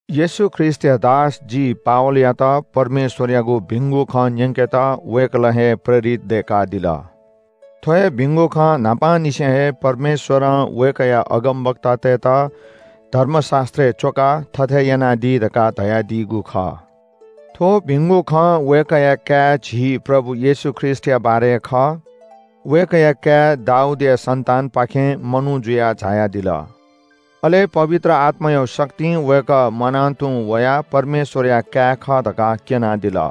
येशू ख्रीष्‍टया दास जि पावलयात परमेश्‍वरयागु भिंगु खँ न्‍यंकेत वय्‌कलं हे प्रेरित दय्‌कादिल। थ्‍व हे भिंगु खँ न्‍हापांनिसें हे परमेश्‍वरं वय्‌कःया अगमवक्तातय्‌त धर्मशास्‍त्रय् च्‍वकाः थथे यानादी धकाः धयादीगु खः। थ्‍व भिंगु खँ वय्‌कःया काय् झी प्रभु येशू ख्रीष्‍टया बारे खः। वय्‌कःया काय् दाऊदया सन्‍तानपाखें मनू जुयाः झायादिल। अले पवित्र आत्‍मायागु शक्तिं वय्‌कः म्‍वाना तुं वयाः परमेश्‍वरया काय् खः धकाः क्‍यनादिल।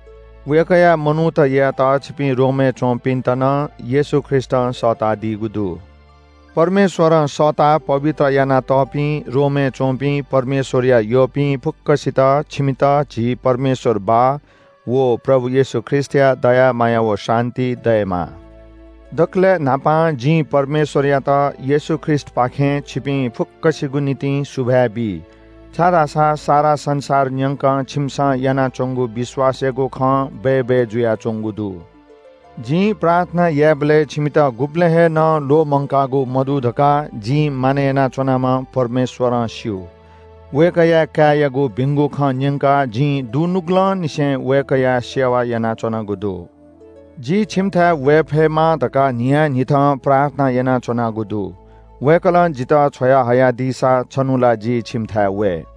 वय्‌कःया मनूत यायेत छिपिं रोमय् च्‍वंपिन्‍त नं येशू ख्रीष्‍टं सःतादीगु दु। परमेश्‍वरं सःताः पवित्र यानातःपिं रोमय् च्‍वंपिं परमेश्‍वरया यःपिं फुक्‍कसित छिमित झी परमेश्‍वर बाः व प्रभु येशू ख्रीष्‍टया दया माया व शान्‍ति दयेमा। दकलय् न्‍हापां जिं परमेश्‍वरयात येशू ख्रीष्‍टपाखें छिपिं फुक्‍कसिगु निंतिं सुभाय् बी, छाय्‌धाःसा सारा संसार न्‍यंक छिमिसं यानाच्‍वंगु विश्‍वासयागु खँ बय्‌बय् जुयाच्‍वंगु दु। जिं प्रार्थना यायेबलय् छिमित गुबलें हे नं ल्‍वःमंकागु मदु धकाः जिं मानय् यानाच्‍वनाम्‍ह परमेश्‍वरं स्‍यू। वय्‌कःया काय्‌यागु भिंगु खँ न्‍यंकाः जिं दुनुगलंनिसें वय्‌कःया सेवा यानाच्‍वनागु दु। जि छिमिथाय् वये फयेमा धकाः न्‍हियान्‍हिथं प्रार्थना यानाच्‍वनागु दु। वय्‌कलं जितः छ्वया हयादीसा छन्‍हु ला जि छिमिथाय् वये।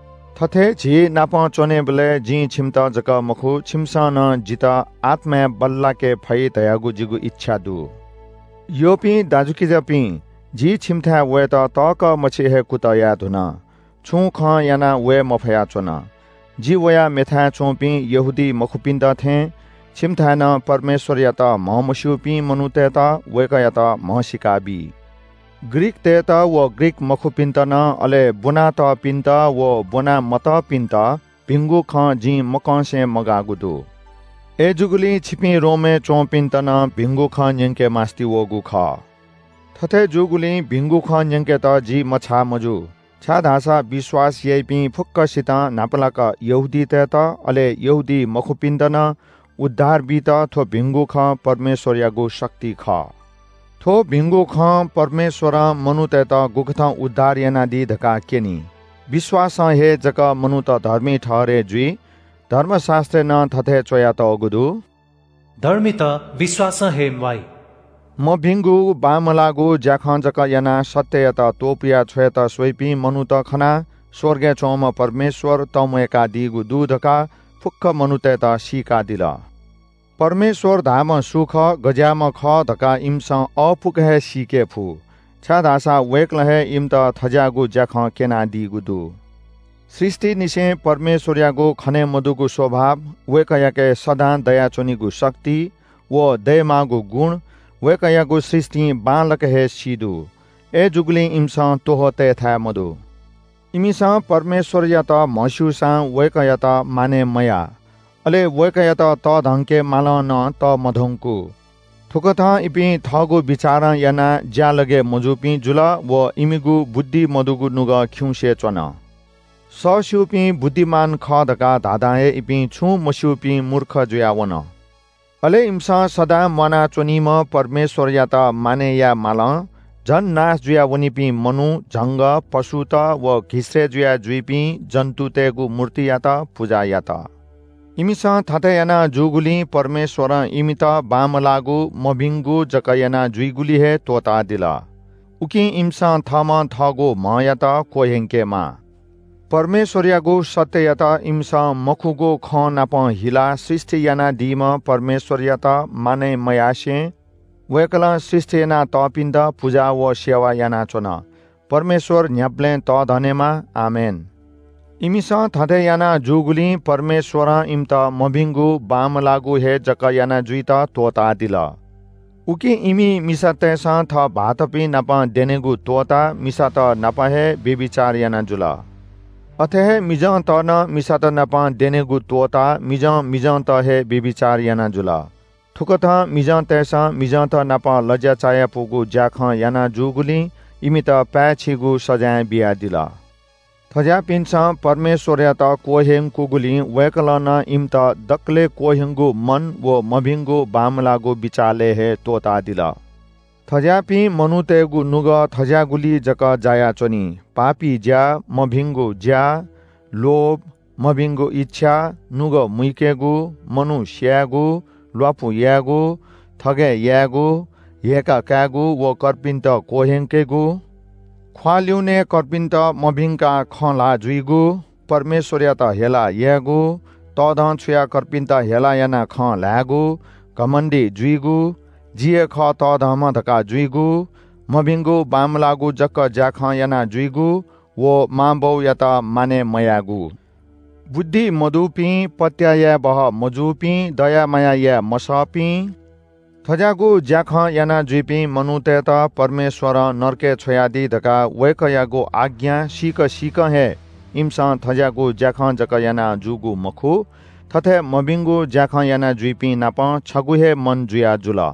थथे झीनाप च्‍वनेबलय् जिं छिमित जक मखु, छिमिसं नं जितः आत्‍माय् बल्‍लाके फइ धयागु जिगु इच्‍छा दु। यःपिं दाजुकिजापिं, जि छिमिथाय् वयेत तःकः मछि हे कुतः याये धुन। छुं खं यानाः वये मफया च्‍वन। जि वयाः मेथाय् च्‍वंपिं यहूदीमखुपिन्‍त थें छिमिथाय् नं परमेश्‍वरयात म्‍हमस्‍यूपिं मनूतय्‌त वय्‌कःयात म्‍हसीका बी। ग्रीकतय्‌त व ग्रीक मखुपिन्‍त नं अले ब्‍वनातःपिन्‍त व ब्‍वनामतःपिन्‍त भिंगु खँ जिं मकंसे मगाःगु दु। अय्‌जूगुलिं छिपिं रोमय् च्‍वंपिन्‍त नं भिंगु खँ न्‍यंके मास्‍ति वःगु खः। थथे जूगुलिं भिंगु खँ न्‍यंकेत जि मछाः मजू। छाय्‌धाःसा विश्‍वास याइपिं फुक्‍कसितं, न्‍हापालाक यहूदीतय्‌त अले यहूदीमखुपिन्‍त नं उद्धार बीत थ्‍व भिंगु खँ परमेश्‍वरयागु शक्ति खः। थ्‍व भिंगु खँ परमेश्‍वरं मनूतय्‌त गुकथं उद्धार यानादी धकाः क्‍यनी। विश्‍वासं हे जक मनूत धर्मी ठहरय् जुइ। धर्मशास्‍त्रय् नं थथे च्‍वयातःगु दु – “धर्मीत विश्‍वासं हे म्‍वाइ।” मभिंगु बांमलाःगु ज्‍याखँ जक यानाः सत्‍ययात त्‍वपुया छ्वयेत स्‍वइपिं मनूत खनाः स्‍वर्गय् च्‍वंम्‍ह परमेश्‍वर तंम्‍वय्‌कादीगु दु धकाः फुक्‍क मनूतय्‌त सीकादिल। परमेश्‍वर धाःम्‍ह सु खः, गज्‍याःम्‍ह खः धकाः इमिसं अःपुक हे सीके फु, छाय्‌धाःसा वय्‌कलं हे इमित थज्‍याःगु ज्‍याखँ क्‍यनादीगु दु। सृष्‍टिंनिसें परमेश्‍वरयागु खने मदुगु स्‍वभाव, वय्‌कःयाके सदां दयाच्‍वनीगु शक्ति, व दयेमाःगु गुण, वय्‌कःयागु सृष्‍टिं बांलाक हे सी दु। अय्‌जूगुलिं इमिसं त्‍वहः तयेथाय् मदु। इमिसं परमेश्‍वरयात म्‍हस्‍यूसां वय्‌कःयात मानय् मयाः। अले वय्‌कःयात तःधंके मालं नं तःमधंकू। थुकथं इपिं थःगु बिचारं यानाः ज्‍यालगय् मजूपिं जुल व इमिगु बुद्धि मदुगु नुगः खिउँसे च्‍वन। सःस्‍यूपिं बुद्धिमान खः धकाः धाधां हे इपिं छुं मस्‍यूपिं मूर्ख जुयाः वन। अले इमिसं सदां म्‍वाना च्‍वनीम्‍ह परमेश्‍वरयात मानय् याये मालं झन नाश जुयावनीपिं मनू, झंगः, पशुत व घिसय्‌ जुया जुइपिं जन्‍तुतय्‌गु मूर्तियात पुजा यात। इमिसं थथे याना जूगुलिं परमेश्‍वरं इमित बांमलाःगु मभिंगु जक याना जुइगुलिइ हे त्‍वःतादिल, ताकि इमिसं थःम्‍हं थःगु म्‍हयात क्‍वह्यंकेमा। परमेश्‍वरयागु सत्‍ययात इमिसं मखुगु खँनापं हिलाः सृष्‍टि यानादीम्‍ह परमेश्‍वरयात मानय् मयासें वय्‌कलं सृष्‍टि यानातःपिन्‍त पुजा व सेवा यानाच्‍वन। परमेश्‍वर न्‍ह्याबलें तःधनेमा। आमेन। इमिसं थथे याना जूगुलिं परमेश्‍वरं इमित मभिंगु बांमलाःगु हे जक याना जुइत त्‍वःतादिल। उकिं इमि मिसातय्‌सं थः भाःतपिं नाप द्यनेगु त्‍वःताः मिसात नाप हे व्‍यभिचार याना जुल। अथे हे मिजंत नं मिसात नाप द्यनेगु त्‍वःताः मिजं मिजंत हे व्‍यभिचार याना जुल। थुकथं मिजंतय्‌सं मिजंतनाप लज्‍या चायापुगु ज्‍याखँ याना जूगुलिं इमित पाय्‌छिगु सजाँय बियादिल। थज्‍याःपिन्‍सं परमेश्‍वरयात क्‍वह्यंकूगुलिं वय्‌कलं नं इमित दकलय् क्‍वह्यंगु मन व मभिंगु बांमलाःगु बिचालय् हे त्‍वःतादिल। थज्‍याःपिं मनूतय्‌गु नुगः थज्‍याःगुलिइ जक जायाच्‍वनी – पापी ज्‍या, मभिंगु ज्‍या, लोभ, मभिंगु इच्‍छा, नुगः मुइकेगु, मनू स्‍यायेगु, ल्‍वापु यायेगु, थगय् यायेगु, हेय्‌काः कायेगु व कर्पिन्‍त क्‍वह्यंकेगु, ख्‍वाः ल्‍युने कर्पिन्‍त मभिंकाः खँ ल्‍हाः जुइगु, परमेश्‍वरयात हेला यायेगु, तःधंछुयाः कर्पिन्‍त हेला यानाः खँ ल्‍हायेगु, घमण्‍डी जुइगु, जि हे खः तःधंम्‍ह धकाः जुइगु, मभिंगु बांमलाःगु जक ज्‍याखँ यानाजुइगु व मां बौयात मानय् मयायेगु। बुद्धि मदुपिं, पत्‍याः याये बहःमजूपिं, दया माया याये मसःपिं, थज्‍याःगु ज्‍याखँ यानाजुइपिं मनूतय्‌त परमेश्‍वरं नरकय् छ्वयादी धकाः वय्‌कःयागु आज्ञा सीक सीकं हे इमिसं थज्‍याःगु ज्‍याखँ जक याना जूगु मखु, थथे मभिंगु ज्‍याखँ यानाजुइपिंनापं छगू हे मन जुयाजुल।